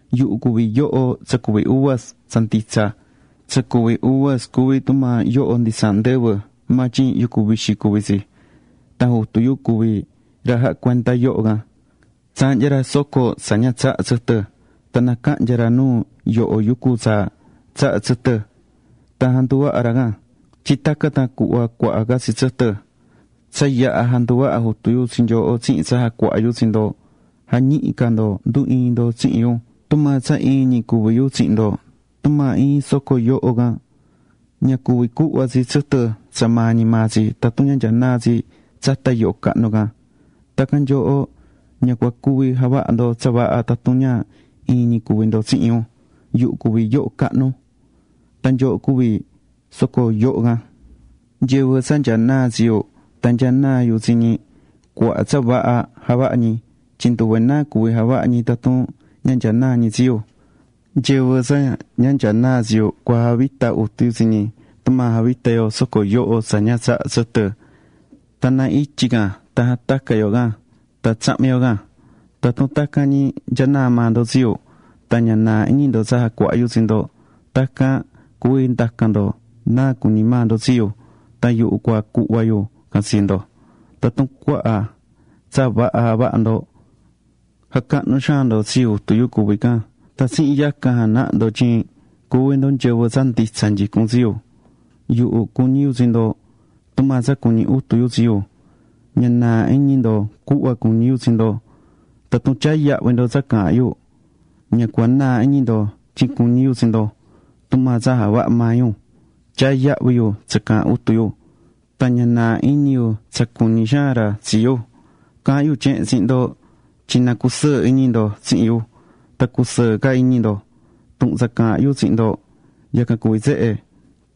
’Yuhu cuví yoho tsa cuví uvas tsa nditsa. [Tsa cuví uvas cuví tsi tumaa yoho nditsaahan ndɨvɨ maa tyin yucu vixi cuví tsi.] Tan Jutu yu cuví ra jahá cuenda yoho can. Tsaahnyá ra soco tsa ña tsahá tsɨtɨ. Tan nacahnya ra nuu yoho yucu tsa tsahá tsɨtɨ, tan janduvahá ra can, tyin tacan tan cuhva cuaha ca tsi tsɨtɨ. Tsa yaha̱ janduvaha̱ Jutu yu tsi nyooho tsihin tsa jacuahá yu tsi ndo. Ja̱ñihi ca ndo ndu iin ndo tsihin yu, tumaa tsa iin ñi cuví yu tsihin ndo. Tumaa iin soco yoho can ña cuvi cuhva tsi tsɨtɨ tsa maa ñi maa tsi, tun ña nyanaá tsi tsata yoho cahnu can, tacan nyooho, ña cua cuvi javaha ndo tsa vaha tatun ña iin ñi cuvi ndo tsihin yu. ’Yuhu cuví yoho cahnu. Tan nyooho cuví soco yoho can. Nyɨvɨ tsa nyanaá tsi yu, tan nyanaá yu tsi ñi, cuaha tsa vaha javahá ñi. Tyin nduve náa cuví javaha ñi tatun ña nyanaá ñi tsi yu. Nyɨvɨ tsa ña nyanaá tsi yu, cua javita Jutu yu tsi ñi, tumaa javitá yo soco yutun tsa ña tsahá tsɨtɨ. Na ityi can tan jatacá yo can, tsahan tsahmí yo. ’Tatun tacan ñi nyanaá maa ndo tsi yu, tan ña naa iñi ndo tsa jacuahá yu tsi ndo, tacan tan cuví nda̱can ndo náa cuñí maa ndo tsi yu, tan yuhu cua cuhva yu tsa cua ndacan ndo. Tatun cuaha tsa vaha javahá ndo, jacahnú xaan ndo tsi Jutu yu cuví can. Tan tsihin yacan janahá ndo tyin cuví ndo nyɨvɨ tsa nditsa nyicún tsi yu. Yuhu cuñí yu tsi ndo, tumaa tsa cuñí Jutu yu tsi yu. Ña naa iñi ndo cuhva cuñí yu tsi ndo. Tatun tyaá yahvi ndo tsa caahán yu, ña cua naa iñi ndo tyin cuñi yu tsi ndo. Tumaa tsa javahá maa yu, tyaá yahvi yu tsa caahán Jutu yu. Ña naa iñi yu tsa cuñí xaan ra tsi yu. ’Caahán yu tyehen tsihin ndo tyin na cusɨɨ iñi ndo tsihin yu. Tan cusɨɨ ca iñi ndo. Tuhun tsa caahán yu tsihin ndo, yacan cuví tsehe: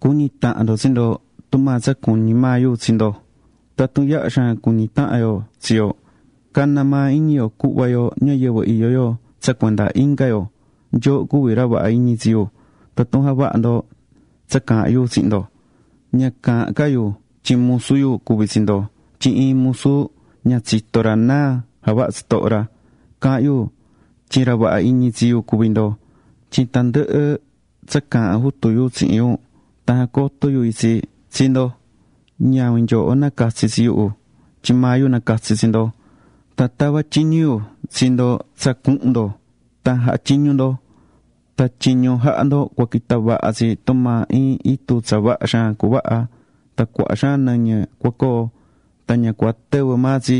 cu̱ñi tahan ndo tsi ndo, tumaa tsa cuñí maa yu tsi ndo. Tatun yaha xaan cuñí tahan yo tsi yo, cana maa iñi yo cuhva yo ñayɨvɨ iyó yo tsa cuenda inga yo. Nyooho cuví ra vaha iñi tsi yu tatun javahá ndo tsa caahán yu tsihin ndo. Ña caahán ca yu tyin musu yu cuví tsi ndo, tyin iin musu ña tsitó ra náa javahá tsitoho ra. Caahán yu tyin ra vaha iñi tsi yu cuví ndo, tyin tandɨhɨ tsa caahán Jutu yu tsihin yu tan jacotó yu itsi tsi ndo. Ñavin nyooho nacatsi̱ tsi yuhu tyin maa yu nacatsi̱ tsi ndo. Tan tavá tyiñu yu tsi ndo tsa cuhun ndo tan jaha tyiñu ndo. Tan tyiñu jahá ndo cua quita vaha tsi, tumaa iin itu tsa vaha xaan cuvaha. Tan cuaha xaan nɨñɨ cua coo, tan ña cua tɨvɨ maa tsi.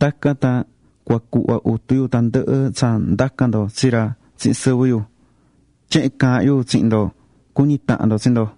Tacan tan cua cuhva Jutu yu tandɨhɨ tsa ndacan ndo tsi ra tsihin sɨvɨ yu. Tyehen caahán yu tsihin ndo: Cu̱ñi tahan ndo tsi ndo.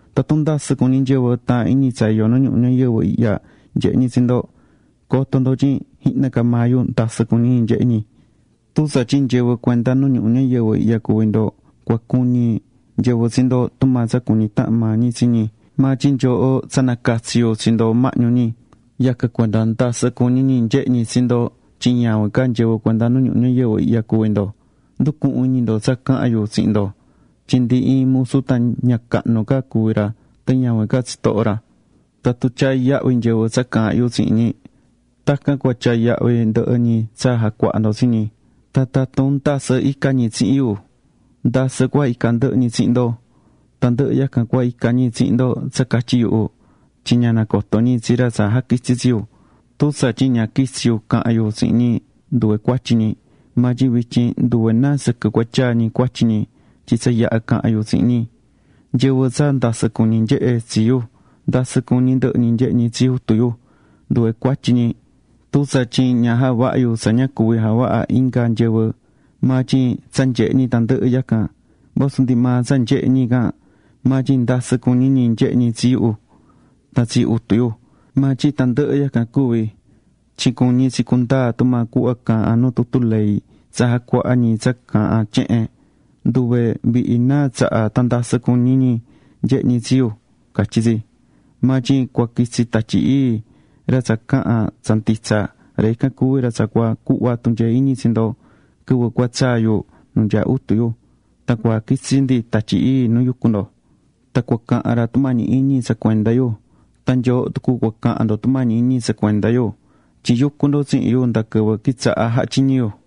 ’Tatun ndasɨ cuñí nyɨvɨ taahán iñi tsa iyó nu ñuhu ñayɨvɨ ihya nyehe ñi tsi ndo, co̱to ndo tyin jihna ca maa yu ndasɨ cuñí ñi nyehe ñi. Tun tsatyin nyɨvɨ cuenda nu ñuhu ñayɨvɨ ihya cuví ndo, cua cuñi nyɨvɨ tsi ndo tumaa tsa cuñí tahan maa ñi tsi ñi. Maa tyin nyooho tsa nacatsi̱ yu tsi ndo mahñu ñi. Yacan cuenda ndasɨ cuñí ñi nyehe ñi tsi ndo, tyin ñavin ca nyɨvɨ cuenda nu ñuhu ñayɨvɨ ihya cuví ndo. Ndu̱cuhun iñi ndo tsa caha̱n yu tsihin ndo, tyin ndi iin musu tan ña cahnu ca cuví ra tan ñavin ca tsitoho ra. Tatun tyaá yahvi nyɨvɨ tsa caahán yu tsihin ñi, tacan cua tyaa yahvi ndɨhɨ ñi tsa jacuahá ndo tsi ñi. Tan tatun ndasɨ́ icá ñi tsihin yu, ndasɨ cua ica ndɨhɨ ñi tsihin ndo. Tandɨhɨ yacan cua ica ñi tsihin ndo tsa catyi yuhu, tyin ña nacotó ñi tsi ra tsa jaquitsi̱ tsi yu. ’Tun tsatyin ña quitsi̱ yu caha̱n yu tsihin ñi, nduve cuatyi ñi. Maa tyin vityin nduve náa sɨquɨ cua tyaa ñi cuatyi ñi, tyin tsa yaha̱ caha̱n yu tsihin ñi. Nyɨvɨ tsa ndasɨ cuñí nyehé tsi yu, ndasɨ cuñí ndɨhɨ ñi nyehé ñi tsi Jutu yu. Nduve cuatyi ñi, tun tsatyin ña javahá yu tsa ña cuví javaha inga nyɨvɨ. Maa tyin tsa nyehe̱ ñi tandɨhɨ yacan. Vasu ndi maa tsa nyehe̱ ñi can maa tyin ndasɨ cuñí ñi nyehé ñi tsi yu, tan tsi Jutu yu. Maa tyin tandɨhɨ yacan cuvi̱, tyin cuñí tsi cundaa tumaa cuhva caahán nu tutu ley tsa jacuahá ñi tsa caahán tyehen: “Nduve vihi náa tsaha, tan ndasɨ cuñi̱ ñi nyehe ñi tsi yu”, catyí tsi. ’Maa tyin cua quitsi Tatyi Ii, ra tsa caahán tsa nditsa. Ra ican cuví ra tsa cua cuhva tunyee iñi tsi ndo. Quɨvɨ cua tsaa yu nu nyaá Jutu yu tan cua jaquitsi ndi Tatyi Ii nu yucú ndo. Tan cua cahan ra tumañi iñi tsa cuenda yu. Tan nyooho tucu cua cahan ndo tumañi iñi tsa cuenda yu, tyin yucú ndo tsihin yu nda quɨvɨ quitsaha̱ jahá tyiñu yu.